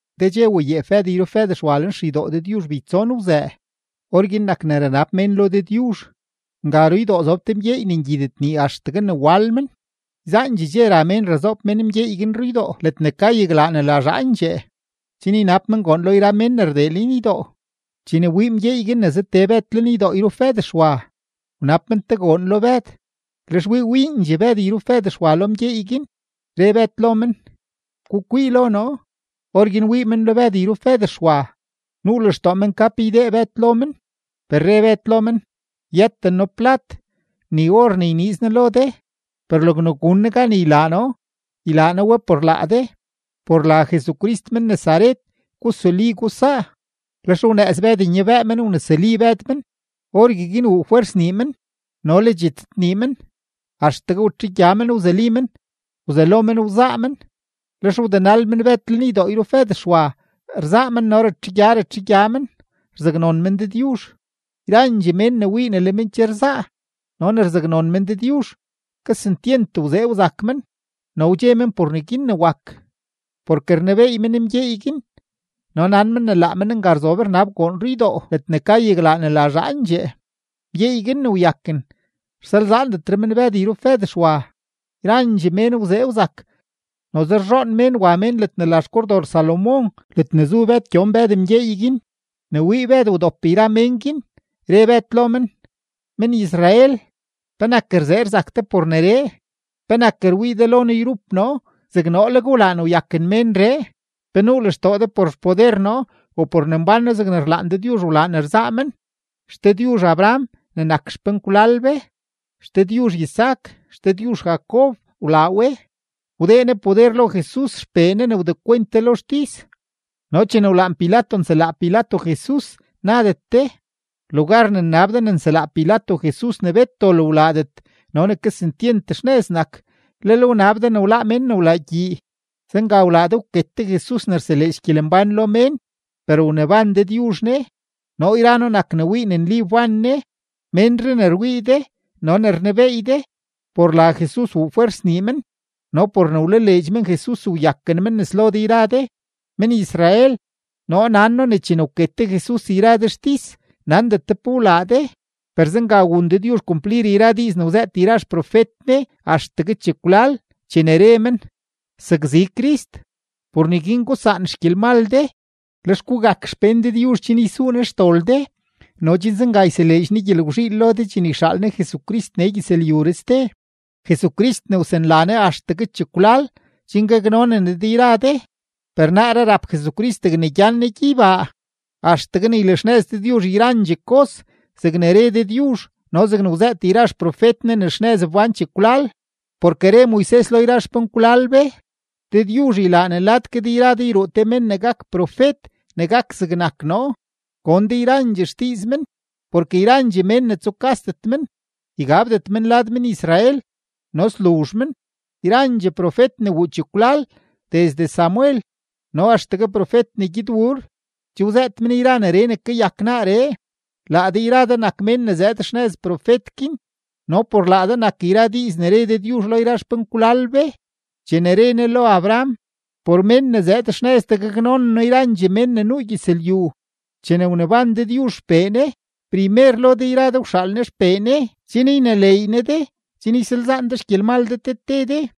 Te dxe wayeep Bëd yrup Bëd Xwa lenxeydoo Dëdyuzh beytson wzëë. Orguin nak ne ranab mén lo Dëdyuzh. Nga ruydoo zob te mgyeey ne ngyidet nii axtegue ne wal men. Yzaandxee dxe ra mén razoob mén mgyeey guin ruydoo ledne ka yaglaa ne la Zhaandxee, chen ynab men goon lo yra mén ne rdee lenydoo. Chene wii mgyeey guin ne za tee Bëd lenydoo yrup Bëd Xwa, wnab men te goon lo Bëd. Lex wii wiindxee Bëd yrup Bëd Xwa lo mgyeey guin, re Bëd lo men: ―Gukwii lo noo. Orguin wii men lo Bëd yrup Bëd Xwa. Nuu lextoo men ka pe ydee Bëd lo men. Per re Bëd lo men: ―Yëten noo plat ni or ne yniiz noo lo de, per logne gun noo gan ylaa noo, ylaa noo we por laa de: ¡por la Jesucrist men-Nazaret gusuli, gusaa! Lex wnëëz Bëd nyabëë men wnesuli Bëd men. Orgueguin wuu fwers nii men no le dxitzëdnii men. Axtegue watxegya men wzuli men, wzelo men wzaa men; lex wdenal men Bëd lenydoo yrup Bëd Xwa, rzaa men no ratxegya ratxegya men, rzaknon men Dëdyuzh. Yrandxee mén ne wii ne le men che rzaa no ne rzaknon men Dëdyuzh, kesentyent wzee wzak men no wdxe men por neguin ne wak, porke rnebeey men mgyeey guin no nan men ne laa men nga rzob rnab goon ruydoo ledne ka yaglaa ne la Zhaandxee. Mgyeey guin ne wyaken, rsalzaandetre men Bëd yrup Bëd Xwa. Yrandxee mén wzee wzak, noze rzhoon mén wa men ledne la xKordor Salomón, ledne zu Bëd gyon Bëd mgyeey guin. Ne wii Bëd wdop yra mén guin, re Bëd lo men: ―Men-Israel, ¿penak rzee rzak de por neree? ¿Penak rwii de lo noo yrup noo zeg noo leg wlaa ne wyaken ménree? ¿Pe nuu lextoo de por xpoder noo u por ne mbán noo zegne rlaan Dëdyuzh wlaa ne rzaa men? XDëdyuzh Abraham ne nak xpenkwlal be, XDëdyuzh Isaac, XDëdyuzh Jacob wlaa we; wdee Ne poder lo Jesus XPee Ne ne wdekwent de lo xtis, no chene wlaan Pilato nselaa Pilato Jesus, nadet de. Lugar ne nnab de ne nselaa Pilato Jesus ne bet dol wlaadet no ne kesentyent xnëz nak, lel wnab de ne wláá mén ne wlaa gyii. Zenga wlaa de wket de Jesus ne rseleedx gyelembán lo mén, per wneban Dëdyuzh Ne. Noo yra noo nak ne wii ne nli wban Ne. Ménree ne rwii de no ne rnebeey de, por la Jesus wuu fwers nii men no por ne wlaleedx men Jesus, wyaken men nes lo de yra de. ’Men-Israel, noo nan noo ne chene wket de Jesus yra de xtis, nandet de pe wlaa de. Per zenga wun Dëdyuzh kumplir yra diiz ne wzëët yra xprofet Ne axtegue chekwlal chene re men: sakzi Crist. Por neguin gusaan xgyelmal de, lex gugak xpén Dëdyuzh, chen ysuu Ne xdol de no chen zenga yseleedx Ne gyelgwzhiil lo de chene yxaal Ne Jesucrist nee gyëzlyuree ste, Jesucrist ne wsanla Ne axtegue chekwlal chen gaknonen Ne de yra de. Per naaree rap Jesucrist degne gyan Ne gyeybaa axtegue ne ylaxnëz Dëdyuzh yrandxee kos zegne re Dëdyuzh no zegne wzëët yra xprofet Ne ne xnëz wbán chekwlal. Porke re Moises lo yra xpenkwlal be: “Dëdyuzh ylaa ne lad ke de yra de yruu te men ne gak profet ne gak zegnak noo; gon de yrandxee xdiiz men, porke yrandxee mén ne tsukasdet men, ygabdetre men lad men-Israel no sluzh men.” ’Yrandxee profet ne wuu chekwlal desde Samuel no axtegue profet ne gyed wuur, che wzëët men yra neree ne kayak naaree. Laa de yra de nak mén ne zëëd xnëz profet guin no por laa de nak yra diiz ne re Dëdyuzh lo yra xpenkwlal be chene re Ne lo Abraham: “Por men ne zëëd xnëz de gaknonen noo yrandxee mén ne nuu gyëzlyu.” Chene wneban Dëdyuzh XPee Ne, primer lo de yra de wxaal Ne XPee Ne chen yneleey Ne de chen ysalzaan de xgyelmal de te te de.